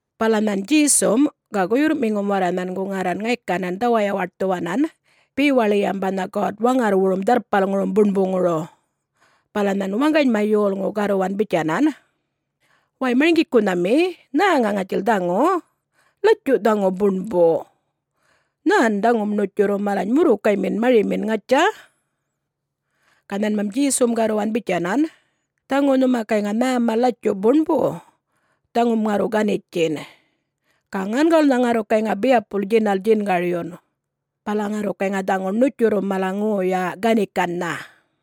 Bala nhan Djesum ga guyurrꞌmiŋum warra nhangu ŋarran ŋaykanan dhawayawaṯthuwanan bewaḻiyam banha God-Waŋarrwurum Dharrpalŋurum Buṉbuŋuru. Bala nhan waŋganyma yolŋu garruwan bitjanan, “Way Marŋgikunhami, nhäŋa ŋatjil dhaŋu, latju dhaŋu buṉbu. Nhän dhaŋum ṉutjurru malany murrukaymin marimin, ŋatja?” Ga nhanmam Djesum garruwan bitjanan, “Dhaŋu nhuma gayŋa nhäma latjuꞌ buṉbu, dhaŋum ŋarru ganitjin. Ga ŋangawulnha ŋarru gayŋa biyapul djinal djingaryun. Bala ŋarru gayŋa dhaŋu ṉutjurrum mala ŋoyan ganikannha.”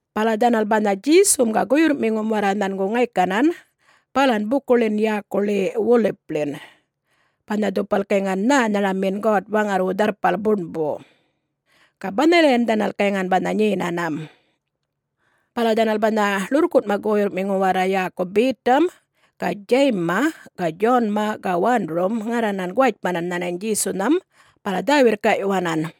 Bala dhanal banha Djesum ga guyurrꞌmiŋum warra nhangu ŋaykanan balan bukuḻin yäkuḻi Wolipḻin banha dhupal gayŋan nhänharamin God-Waŋarrwu Dharrpal Buṉbu, ga banhalayan dhanal gayŋan banha nyenanam. Bala dhanal banha ḻurrkunꞌma guyurrꞌmiŋu warra yäku Betam ga Djayimma ga Djonma ga Wandurum ŋarranan guwatjmanan nhanany Djesunham bala dhä-wirrkaꞌyuwanan,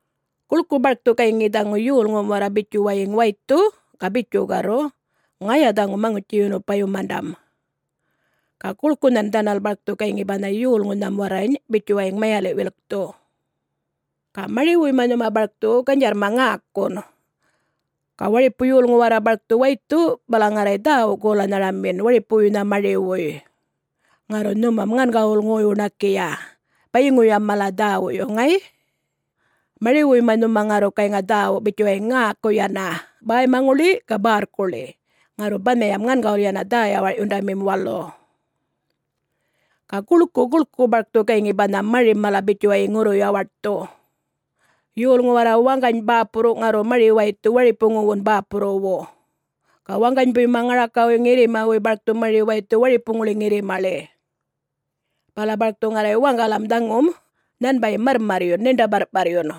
Guḻku barkthu gayŋi dhaŋu yolŋum warra bitjuwayiŋ waythu ga bitju garru, ‘Ŋaya dhaŋu Maŋutji-yunupayumandam,’ ga guḻkunhan dhanal barkthu gayŋi banha yolŋunham warrany bitjuwayiŋ mayaliꞌ-wilkthu. Ga mariwuyma nhuma barkthu ganydjarrma ŋäkun. Ga waripu yolŋu warra barkthu waythu bala ŋarray dhäwu-golanharamin waripuwuynha mariwuy. Ŋarru nhumam ŋangawulnha ŋoy-wuṉakiya bayiŋuyam mala dhäwuyu, ŋay? Mariwuyma nhuma ŋarru gayŋa dhäwu bitjuwayiŋ ŋäku yana, bäymaŋuḻi ga bärrkuḻi, ŋarru banhayam ŋangawul yana dhä-yawarꞌyundamim walu. Ga guḻku guḻku barkthu gayŋi banha marim mala bitjuwayiŋ ŋurru-yawaṯthu. Yolŋu warra waŋgany bäpurru ŋarru mari-waythu waripuŋuwun bäpurruwu. Ga waŋganybuyma ŋarakawuy ŋirrimawuy barkthu mari waythu waripuŋuḻi ŋirrimaḻi. Bala barkthu ŋarray waŋgalam dhaŋum nhanbayim marrmarryun, ṉiṉḏa-barrꞌparrun.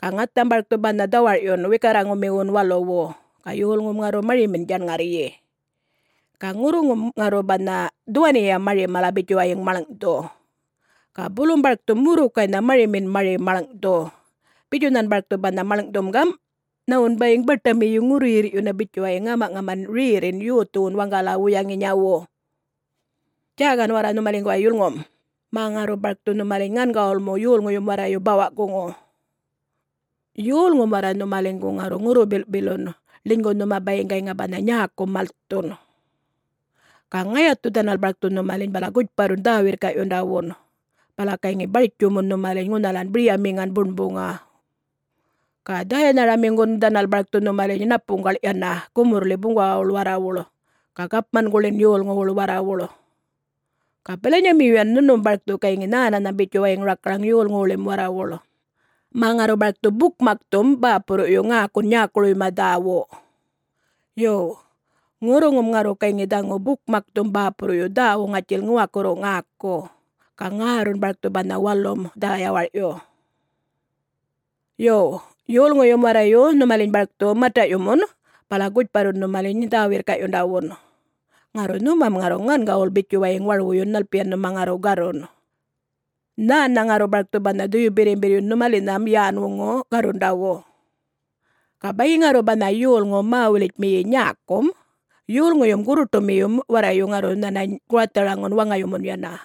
Ga ŋatham barkthu banha dhawarꞌyun wikarraŋumiwun waluwu, ga yolŋum ŋarru marimin djaṉŋarryi. Ga ŋurruŋum ŋarru banha dhuwaniya mari mala bitjuwayiŋ maḻŋꞌthu. Ga bulum barkthu murrukaynha marimin mari maḻŋꞌthu. Bitju nhan barkthu banha maḻŋꞌthum gam: Nhawun bayiŋ baṯamiyu ŋurruyirrꞌyuna bitjuwayiŋ ŋämaꞌŋaman rerrin yothuwan waŋgala-wuyaŋinyawun. Djäkan warra nhumaliŋguway yulŋum, mä ŋarru barkthu nhumaliny ŋangawulmu yolŋuyum warrayu bawaꞌ-guŋu. Yolŋum warra nhumaliŋgu ŋarru ŋurru-bilꞌpilun ḻinygu nhuma bayiŋ gayŋa banha nyäku malthun. Ga ŋayathu dhanal barkthu nhumaliny bala gutjparrun dhä-wirrkaꞌyundawun, bala gayŋi bartjumun nhumaliny ŋunhalan biryamiŋan buṉbuŋa. Ga dhäyanharamiŋgum dhanal barkthu nhumaliny ṉapuŋgaḻ yana gumurrḻi buŋgawawuḻ warrawuḻ ga gapmanguḻin yolŋuwuḻ warrawuḻ. Ga bilanyamiyuyan nhunum barkthu gayŋi nhänanham bitjuwayiŋ rakaraŋ yolŋuwuḻim warrawuḻ, mä ŋarru barkthu bukmakthum bäpurruꞌyu ŋäkun nyäkuruyma dhäwu. Yo, ŋurruŋum ŋarru gayŋi dhaŋu bukmakthum bäpurruyu dhäwu ŋatjil ŋuwakurru ŋäku, ga ŋärrun barkthu banha walum dhä-yawarꞌyu. Yo, yolŋuyum warrayu nhumaliny barkthu mataꞌyumun bala gutjparrun nhumaliny dhä-wirrkaꞌyundawun, ŋarru nhumam ŋarru ŋangawul bitjuwayiŋ warwuyun nhalpiyan nhuma ŋarru garrun. Nhännha ŋarru barkthu banha Dhuyu-Birrimbirryun nhumalinham yän-wuŋu garrundawum. Ga bayiŋ ŋarru banha yolŋu mä-wulitjmiyi nyäkum, yolŋuyum gurruṯumiyum warrayu ŋarru nhanany guwatharaŋun waŋayumun yana.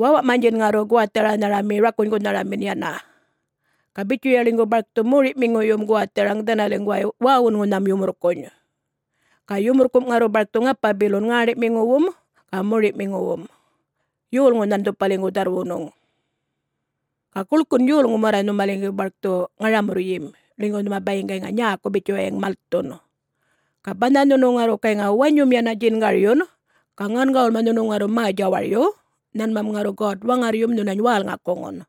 Wäwa'manydjin ŋarru guwatharanharami rakunygunharamin yana. Ga bitjuya ḻinygu barkthu mori'miŋuyum guwatharaŋ dhanaliŋguway wäwunŋunhan yumurrkuny'. Ga yumurrkum' ŋarru barkthu ŋapa-bilun ŋäṉḏi'miŋuwum ga mori'miŋuwum, yolŋunhan dhupaliŋgu dharrwunuŋ. Ga guḻkun yolŋum warra nhumaliŋgu barkthu ŋaramurryim, ḻinygu nhuma bayiŋ gayŋa nyäku bitjuwayiŋ malthun. Ga banha nhunu ŋarru gayŋa wanyum yana djingaryun ga ŋangawulma nhunu ŋarru mä-djawaryu, nhanmam ŋarru God-Waŋarryum nhunany wälŋakuŋun.”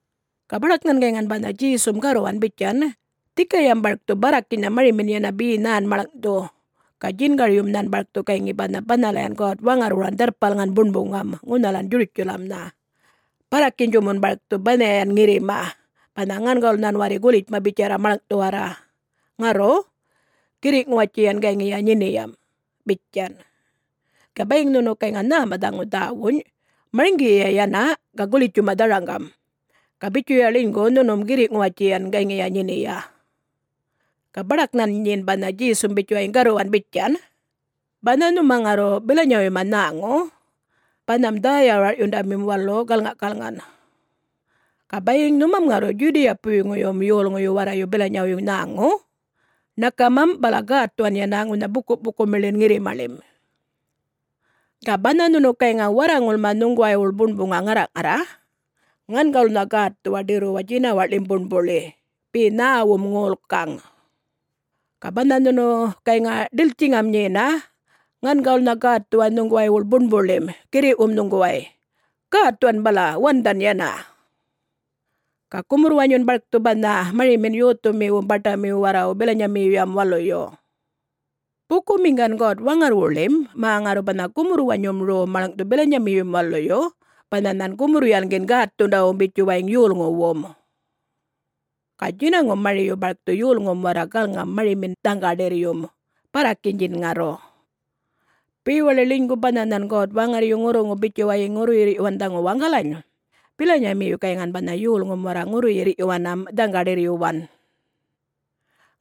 Ga baḏak nhan gayŋan banha Djesum garruwan bitjan, “Dhikayam barkthu barrakinynha marimin yana be nhän maḻŋꞌthu. Ga djingaryum nhan barkthu gayŋi banha banhalayan God-Waŋarrwuran Dharrpalŋan Buṉbuŋam ŋunhalan Djurutjalamnha, barrakinydjumun barkthu banhayan ŋirrima, banha ŋangawul nhan warri gulitjma bitjarra maḻŋꞌthuwarra. Ŋarru, girriꞌ-ŋuwatjiyan gayŋiya nyiniyam,” bitjan. (Ga bayiŋ nhunu gayŋa nhäma dhaŋu dhäwuny, marŋgiyiya yana ga gulitjuma dharaŋgam, ga bitjuya ḻinygu nhunum girriꞌ-ŋuwatjiyan gayŋiya nyiniya.) Ga baḏak nhan nyin banha Djesum bitjuwayiŋ garruwan bitjan, “Banha nhuma ŋarru bilanyawuyma nhäŋu, banham dhä-yawarꞌyundamim walu galŋaꞌkalŋan. Ga bayiŋ nhumam ŋarru Djudiyawupuyŋuyum yolŋuyu warrayu bilanyawuy nhäŋu, ṉakamam bala gätthuwan yana ŋunha bukuꞌpukumiḻin ŋirrimaḻim. Ga banha nhunu gayŋa warraŋulma nhuŋguwaywuḻ buṉbuŋa ŋarraꞌŋarra, ŋangawulnha gätthuwa ḏirruwa djinawaꞌḻim buṉbuḻi be nhäwum ŋolkaŋ. Ga banha nhunu gayŋa ḏiltjiŋam nyena, ŋangawulnha gätthuwa nhuŋguwaywuḻ buṉbuḻim girriꞌwum nhuŋguway, gätthuwan bala wandhan yana. Ga gumurr-wanyun barkthu banha marimin yothumiwum baṯamiwu warrawu bilanyamiyuyam waluyu. Bukumiŋgan God-Waŋarrwuḻim, mä ŋarru banha gumurr-wanyum rom maḻŋꞌthu bilanyamiyu waluyu, banha nhan gumurr-yalŋgin gätthundawum bitjuwayiŋ yolŋuwum. Ga djinaŋum mariyu barkthu yolŋum warra galŋam marimin dhaŋga-ḏirryum, barrakinydjin ŋarru. Bewaḻi ḻinygu banha nhan God-Waŋarryu ŋurruŋu bitjuwayiŋ ŋurruyirrꞌyuwan dhaŋu waŋgalany, bilanyamiyu gayŋan banha yolŋum warra ŋurruyirrꞌyuwanam dhaŋga-ḏirryuwan.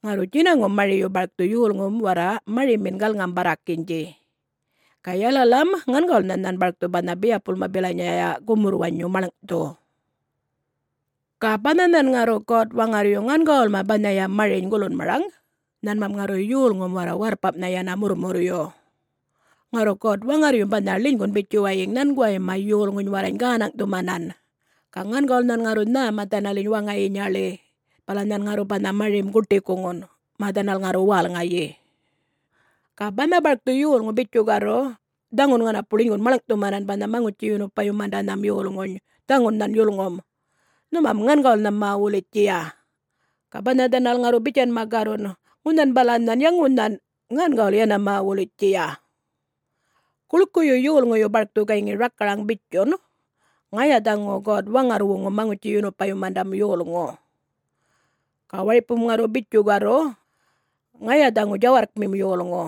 Ŋarru djinaŋum mariyu barkthu yolŋum warra marimin galŋam-barrakinydji. Ga yalalam ŋangawulnha nhan barkthu banha biyapulma bilanyaya gumurr-wanyu maḻŋꞌthu. Ga banha nhan ŋarru God-Waŋarryu ŋangawulma banhaya mariny gulunmaraŋ, nhanmam ŋarru yolŋum warra warrpamꞌnha yana murrmurryu. Ŋarru God-Waŋarryum banha ḻinygun bitjuwayiŋ nhanguwayma yolŋuny warrany gänaŋꞌthumanan, ga ŋangawul nhan ŋarru nhäma dhanaliny waŋayinyaḻi bala nhan ŋarru banha marim guṯikuŋun, mä dhanal ŋarru wälŋayi. Ga banha barkthu yolŋu bitju garru, ‘Dhaŋun ŋanapu ḻinygun maḻŋꞌthumanan banha Maŋutji-yunupayumandanham yolŋuny, dhaŋun nhan yulŋum.’ Nhumam ŋangawulnha mä-wulitjiya. Ga banha dhanal ŋarru bitjanma garrun, ‘Ŋunhan bala nhan, ya ŋunhan,’ ŋangawul yana mä-wulitjiya. Guḻkuyu yolŋuyu barkthu gayŋi rakaraŋ bitjun, “Ŋaya dhaŋu God-Waŋarrwuŋum Maŋutji-yunupayumanda yolŋu.” Ga waripum ŋarru bitju garru, “Ŋaya dhaŋu djawarrkmim yolŋu,”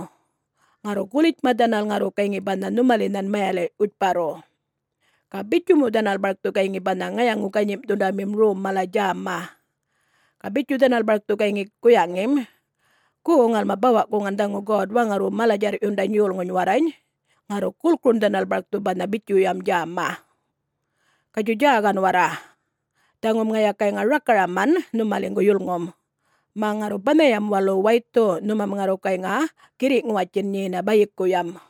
ŋarru gulitjma dhanal ŋarru gayŋi banha nhumalinhan mayaliꞌ-wutjparru. Ga bitju mu dhanal barkthu gayŋi banha ŋayaŋu-ganyimꞌthundamim rom mala djäma. Ga bitju dhanal barkthu gayŋi guyaŋim, ‘Gu, ŋalma bawa-guŋan dhaŋu God-Waŋarrwu mala-djarrꞌyundany yolŋuny warrany.’ Ŋarru gulkurun dhanal barkthu banha bitjuyam djäma. Gatjuy djäkan warra! Dhaŋum ŋaya gayŋa rakaraman nhumaliŋgu yulŋum, mä ŋarru banhayam walu waythu, nhumam ŋarru gayŋa girriꞌ-ŋuwatjin nyena bayikuyam.”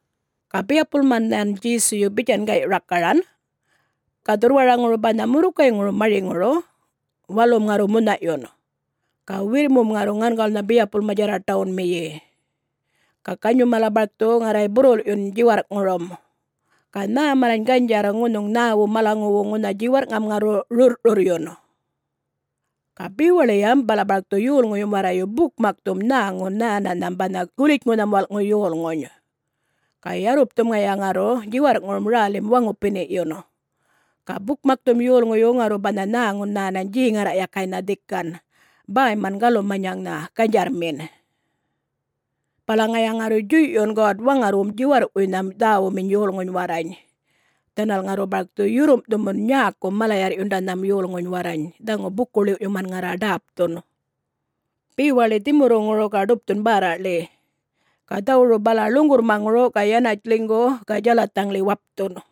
Ga biyapulma nhan Djesuyu bitjan gayꞌ rakaran, “Ga dhurrwaraŋuru banha murrukayŋurum mariŋuru, walum ŋarru munhaꞌyun ga wirrmum ŋarru ŋangawulnha biyapulma djarraṯawunmiyi. Ga ganyum mala barkthu ŋarray burrulꞌyun djiwarrꞌŋurum ga nhä malany ganydjarr ŋunhuŋ nhäwu malaŋuwu ŋunha djiwarrꞌŋam ŋarru rurrꞌrurryun. Ga bewaḻiyam bala barkthu yolŋuyum warrayu bukmakthum nhäŋun nhänanham banha Gulitjŋunham Walꞌŋu Yolŋuny. Ga yarrupthum ŋaya ŋarru djiwarrꞌŋurum rälim waŋupiniꞌyun. Ga bukmakthum yolŋuyu ŋarru banha nhäŋum nhänany djeŋarraꞌyakaynha dhikan, bäyman galumanyaŋnha, ganydjarrmin. Bala ŋaya ŋarru djuyꞌyun God-Waŋarrwum djiwarrꞌwuynham dhäwuminy yolŋuny warrany, dhanal ŋarru barkthu yurrumꞌthumun nyäkum mala-yarrꞌyundanham yolŋuny warrany dhaŋu buku-ḻiwꞌyuman ŋarra ḏäpthun, bewaḻi dhimurruŋuru ga ḏupthun bärraꞌḻi ga dhawuru bala ḻuŋgurrmaŋuru ga yanatj ḻinygu-u-u ga djalathaŋḻi wapthun.”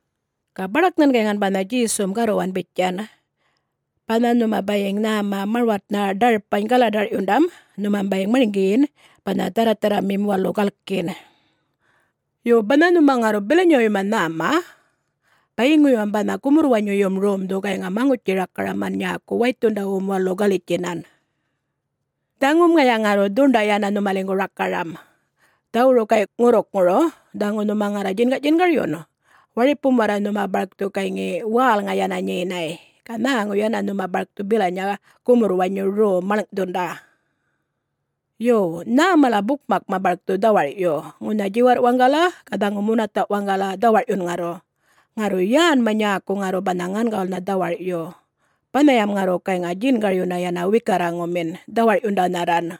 Ga baḏak nhan gayŋan banha Djesum garruwan bitjan, “Banha nhuma bayiŋ nhäma marwatnha ḏarpany galaḏarꞌyundam nhumam bayiŋ marŋgiyin banha dharratharramim walu galkin. Yo, banha nhuma ŋarru bilanyawuyma nhäma, bayiŋuyam banha gumurr-wanyuyum romdhu gayŋa maŋutji-rakaraman nyäku waythundawum walu galitjinan. Dhaŋum ŋaya ŋarru dhuṉḏay yana nhumaliŋgu rakaram! Dhawuru gayꞌ ŋurrukŋuru, dhaŋu nhuma ŋarra djingaꞌdjingaryun, waripum warra nhuma barkthu gayŋi wälŋa yana nyenay, ga nhäŋu yana nhuma barkthu bilanya gumurr-wanyu rom maḻŋꞌthunda. Yo! Nhäm mala bukmakma barkthu dhawarꞌyun, ŋunha djiwarrꞌ waŋgala ga dhaŋu munathaꞌ waŋgala, dhawarꞌyun ŋarru. Ŋarru yänma nyäku ŋarru banha ŋangawulnha dhawarꞌyu, banhayam ŋarru gayŋa djingaryuna yana wikarraŋumin, dhawarꞌyundanharran.”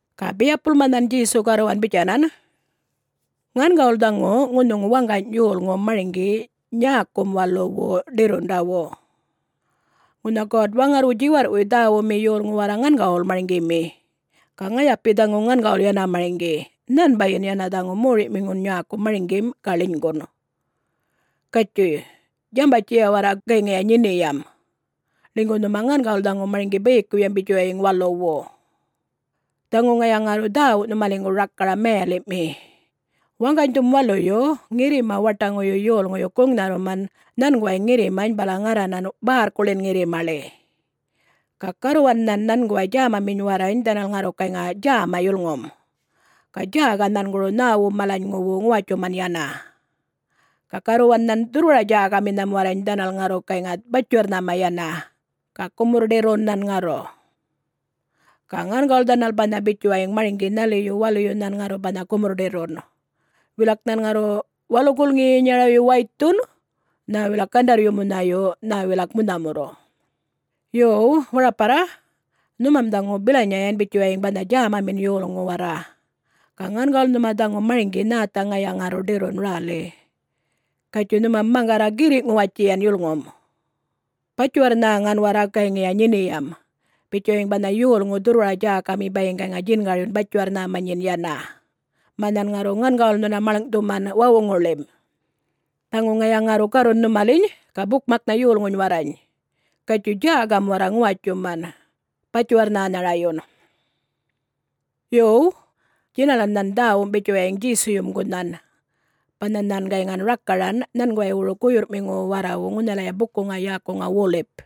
Ga biyapulma nhan Djesu garruwan bitjanan, “Ŋangawul dhaŋu ŋunhuŋ waŋgany yolŋu marŋgi nyäkum waluwu ḏirrundawu. Ŋunha God-Waŋarrwu djiwarrꞌwuy dhäwumi yolŋu warra ŋangawul marŋgimi. Ga ŋayapi dhaŋu ŋangawul yana marŋgi. Nhanbayin yana dhaŋu Moriꞌmiŋun nyäku marŋgim, ga ḻinygun. Gatjuy, djambatjiya warra gayŋiya nyiniyam, ḻinygu nhuma ŋangawul dhaŋu marŋgi bayikuyam bitjuwayiŋ waluwu. Dhaŋu ŋaya ŋarru dhäwu nhumaliŋgu rakaram mayaliꞌmi: Waŋganydhum waluyu ŋirrima-waṯaŋuyu yolŋuyu guŋnharruman nhanguway ŋirrimany bala ŋarranan bärrkuḻin ŋirrimaḻi. Ga garruwan nhan nhanguway djämaminy warrany, dhanal ŋarru gayŋa djäma yulŋum, ga djäka nhanguru nhäwum malanyŋuwu ŋuwatjuman yana. Ga garruwan nhan dhurrwara-djäkaminham warrany dhanal ŋarru gayŋa batjiwarr-nhäma yana, ga gumurr-ḏirrun nhan ŋarru. Ga ŋangawul dhanal banha bitjuwayiŋ marŋgi nhaliyu waluyu nhan ŋarru banha gumurr-ḏirrun. Wilak nhan ŋarru walu gulŋiyinyarayu waythun nhä wilak gandarryu munhayu, nhä wilak munhamurru. Yuw, waraparra, nhumam dhaŋu bilanyayan bitjuwayiŋ banha djämamin yolŋu warra, ga ŋangawul nhuma dhaŋu marŋgi nhätha ŋaya ŋarru ḏirrun räli. Gatjuyꞌ, nhumam maŋgarra girriꞌ-ŋuwatjiyan yulŋum. Batjiwarr-nhäŋan warra gayŋiya nyiniyam, bitjuwayiŋ banha yolŋu dhurrwara-djäkami bayiŋ gayŋa djingaryun batjiwarr-nhäma nyin yana, mä nhan ŋarru ŋangawul nhuna maḻŋꞌthuman wawuŋuḻim. Dhaŋu ŋaya ŋarru garruna nhumaliny, ga bukmaknha yolŋuny warrany, ‘Gatjuy djäkam warra ŋuwatjuman, batjiwarr nhänharayun.’” [Yo, djinalan nhan dhäwum bitjuwayiŋ Djesuyum gunhan, banha nhan gayŋan rakaran nhanguwaywuru guyurrꞌmiŋuwu warrawu ŋunhalaya bukuŋa yäkuŋa Wolip.]